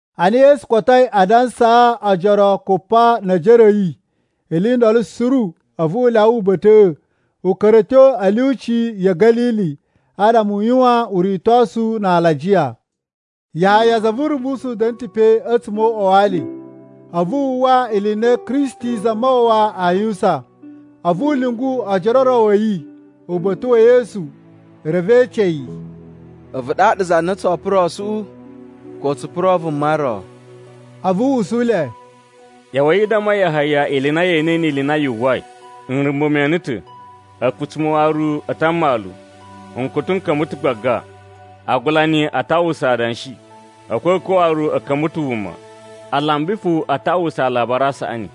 Ana Yesu kotoi a dansaa ojoro kupa ne ejere a̱ yi ili i ndolo suru, a̱vu u lyawa uba̱ta̱ꞌa̱, u ka̱ra̱ a̱ tyo e ilyuci ya̱ Ga̱lili adama u yuwan uritosu na alajiya. Yahaya za vu Urumbusu da̱na̱ ta̱ pe a̱tsuma̱ o uꞌwa wa ali, a̱vu wu uwwa ili i na Kristi Zamawawa aa yuwusan. A̱vu u lyungu ojoro o ro a̱ yi uba̱ta̱ wa̱ Yesu. Reve e ece yi, “A̱vu ɗaɗa za na tsoo purosuꞌu, ko tsu puro vuma ro?” A̱vu u usu le, “ꞌYa̱wa̱i i damma Yahaya ili i na ye enei ni ili i na yu uwwai. Nrumba̱ me ene ta̱, a̱kutsuma̱ waru a ta mmalu, nkutu n ka̱mba̱ ta̱ gbaga. Agulani a ta uwwusa adanshi, a̱kwa̱kwa̱ waru a̱ ka̱mba̱ ta̱ wuma, alambi fo a ta uwwusa Alabari a Saꞌani.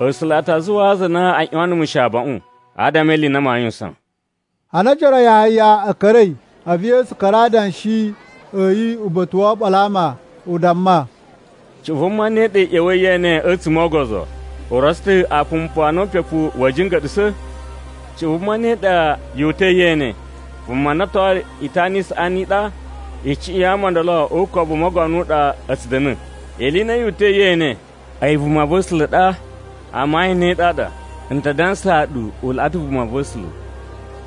A̱sula̱ a ta zuwaa aza a na a ꞌyuwan numu shi abaꞌun, adama e ili i na maa yuwusan.” Ana ojoro a Yahaya a̱ ka̱ra̱i, a̱vu Yesu ka̱ra̱ a adanshi a̱ yi uba̱ta̱ wo oɓolo a ama. U damma, “Cuꞌun vuma ne ɗa i ꞌya̱wa̱i ye ene a̱tsuma̱ o ogozo? U rotso ta̱ apumpu a na upepu wa̱a̱ jinga̱ɗa̱sa̱? Cuꞌun vuma ne ɗa yu uta̱i ye ene? Vuma na otoyi itana i saꞌani i ɗa? Icuꞌun ya ama o ndolo o ukobu u mogono u ɗa a̱ tsu da̱na̱. Ili i ne yu uta̱i ye ene? A̱yi vumava̱sula̱ ɗa? Amayun ne ɗaɗa, n ta dansaa ɗu u laꞌa ta̱ vumava̱sula̱.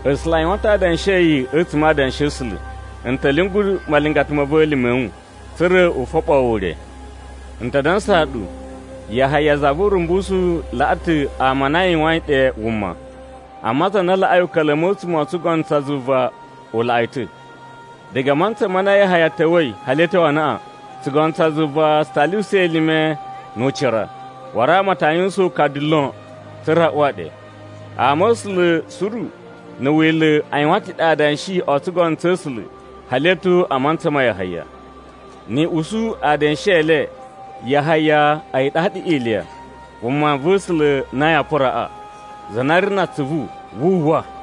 A̱sula̱ a yuwan ta̱ adanshi a̱ yi a̱tsuma̱ a Adanshi a̱ A̱sula̱: ‘N ta̱ lyungu malingata ma̱ va̱ elime a̱ wu, tsa̱ra̱ u foɓoo wu ure.’ “N ta dansaa ɗu, Yahaya za vu Urumbusu laꞌa ta̱ ama a na a yuwain ɗe wuma. Amma za na laꞌai uka̱la̱mu a̱tsuma̱ o tsugono tsa zuva u laꞌa yi ta̱. Diga a mantsa ma na Yahaya ta̱wa̱i hali a̱ tyo anaꞌan, tsugono tsa zuva tsu ta lyuwusa elime nu ucira, waru ama a ta yuwusan ukadu lon tsa̱ra̱ a uwa ɗe. Ama̱sula̱ suru na̱ Wila̱ a yuwan ta̱ ɗe adanshi o tsugono tsa̱ A̱sula̱ hali a̱ tyo a mantsa ma Yahaya. Ni i usu adanshi e le, Yahaya a̱yi ɗaɗa Iliya, vumava̱sula̱ na yaa puraꞌa. Za na ri na atsuvu, wu uwwa!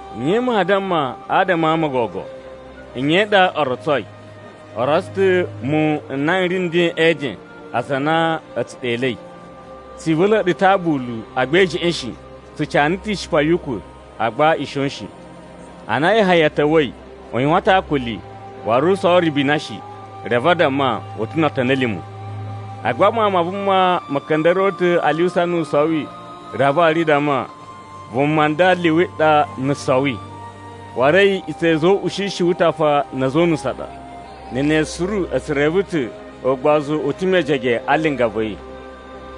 “Nye maa damma adama a ama o gogo? Nye i ɗa o rotsoi? O rotso ta̱ muwun n na n ri nden e eden, aza a na a̱ tsu ɗelei: ‘Tsi ivula̱a̱ ɗu ta̱ aabulu, agba i jeꞌen shi! Tsu cana ta̱ ishipa yu ukwa̱, agba i shon shi!’ “Ana Yahaya ta̱wa̱i, u yuwan ta̱ akuli, waru u sowo ribina shi, reve a damma, ‘U ta̱ no otoni a̱ lima̱!’ Agba Mawun ma Vuma ma̱ ka̱nda̱ruwa̱ ta̱ a lyuwusa nu u sowi, reve waru i damma, ‘Vuma nda liwi ɗa na̱ sowi! Waru a̱yi iꞌutsa̱ ya̱ a̱za̱ o uꞌushishi wu utafa na̱ a̱za̱ o unusu a ɗa.’ Na̱ ne suru a̱ tsu reve ta̱ ugbozu u ta̱ mejege a linga va̱ yi.”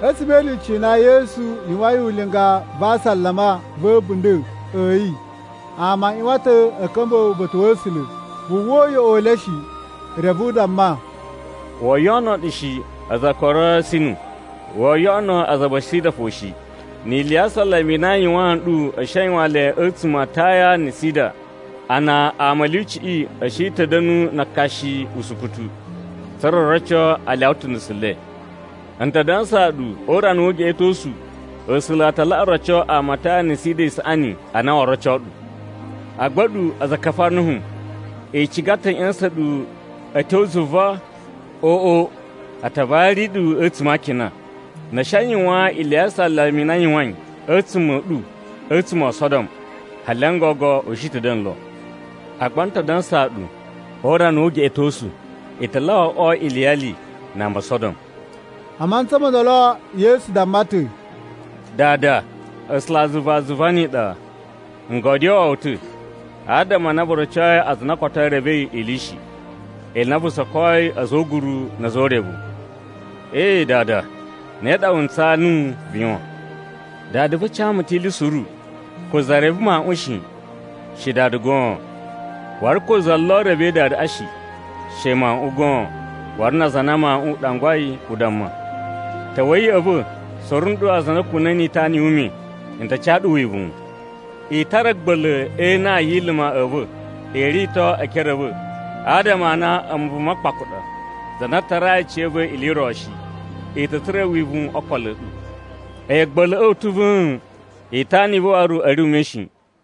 A̱tsuma̱ e ilyuci i na Yesu yuwain linga va asalama va̱ a̱bunda̱ a̱ yi, ama a ꞌyuwan ta̱ a̱ ka̱mba̱ uba̱ta̱ wa̱ A̱sula̱. Wu uwwa uyoꞌo u le shi, reve u damma, “Woo yoꞌono ɗu shi, aza a Korasinu! Woo yoꞌono aza a Besaida fo shi! Ni ili ya asalama i na n yuwaan ɗu a̱ shi a yuwan le a̱tsuma̱ a Taya na̱ Sida, a na ama e ilyuciꞌi a̱ shi ta̱ da̱nu na akashi usukutu, tsa̱ra̱ o roco a lyawa ta̱ nusu le! N ta dansaa ɗu, o urana wu ugeꞌetosu A̱sula̱ a ta laꞌa roco ama a Taya na̱ Sida isaꞌani a na woo roco ɗu. Agba a̱ɗu, aza a Kafarnahum! I ciga ta̱ a̱ ꞌya̱sa̱n ɗu a̱ tyo zuva? Oꞌo! A ta vari ɗu a̱tsuma̱ a akina! Na̱ a̱ shi a yuwan ili ya asalama i na n yuwain a̱tsuma̱ a̱ ɗu a̱tsuma̱ o Sodom, hali n gogo u shi ta̱ a̱ da̱na̱ lo! Agba n ta dansaa ɗu, o urana wu ugeꞌetosu, i ta laꞌa oꞌwo iliyali na ama o Sodom.” A mantsa mo ndolo Yesu damma ta̱, “Dada, A̱sulazuva a zuva ni iɗa! N godyoo wu ta̱, adama a na vu rocoi aza a na koto e revei ili shi, ili i na vu sokoyi a̱za̱ o uguru na̱ a̱za̱ o urevu. Ee, Dada, ne ɗa wu ntsaa nuwu vu yuwan! “Dada va̱ ca mu ta̱ ili suru. Ko za reve Mawuꞌun shi, she Dada goon. Waru ko za lo revei Dadaꞌa shi, she Mawuꞌun goon, waru na aza a na Mawuꞌun u ɗangwai u damma. “Ta̱wa̱i ya̱ꞌa̱ va̱, suru nɗu aza a na a̱ kuna̱i ni itana yu ume, n ta ca ɗu wivuwun. I tara a̱a̱gba̱la̱ e inan yi iluma a̱ va̱, i rito e ekere a̱ va̱, adama a na a̱mu vuma kpaku ɗa, za na tarai aciya̱yi ili i ro shi, i ta̱ tsura̱ wivuwun o okolo a̱ ɗu. A̱yi a̱a̱gba̱la̱ꞌa̱ u ta̱ va̱a̱n, itana i va̱ waru a̱ ri ume shi.”